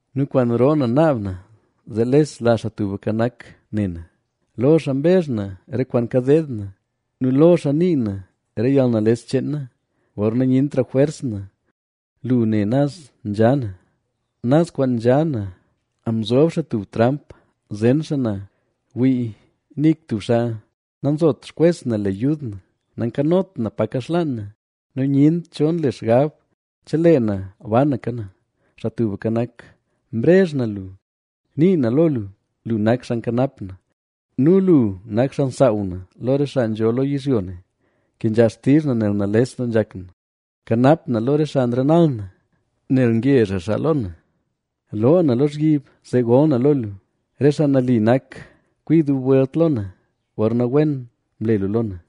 nu kwaan roo na naab na zee lesla Xaa Tubka Nak ne na. Lo xaa mbezh na re kwaan kadeed na; nu lo xaa nii na re yalnales cheen na. Gorna nyentra jwers na, lu ne naz nzha na. ¡Naz kwaan nzha na, mzob xaa tub tramp zen xaa na! Wii, nik tub xaa nanzot xkwes na le yud na. Nankanot na pa kaxlaan na, nu nyent cho nle xgab chelee na banaka na. Xaa Tubka Nak, mrezh na lu; nii na lo lu: “Lu nak xaa nkanap na nu lu nak xaa nsaaw na lo re xaa nzho lo yizhyo ne”. Kenzha xtizh na nel nales doo nzhak na; kanap na lo re xaa nrenal na, nel ngezhra xaa lo na. Loo na lozhyib zee gol na lo lu. Re xaa nali nak kwi dub welt lo na, gorna wen mle lu lo na.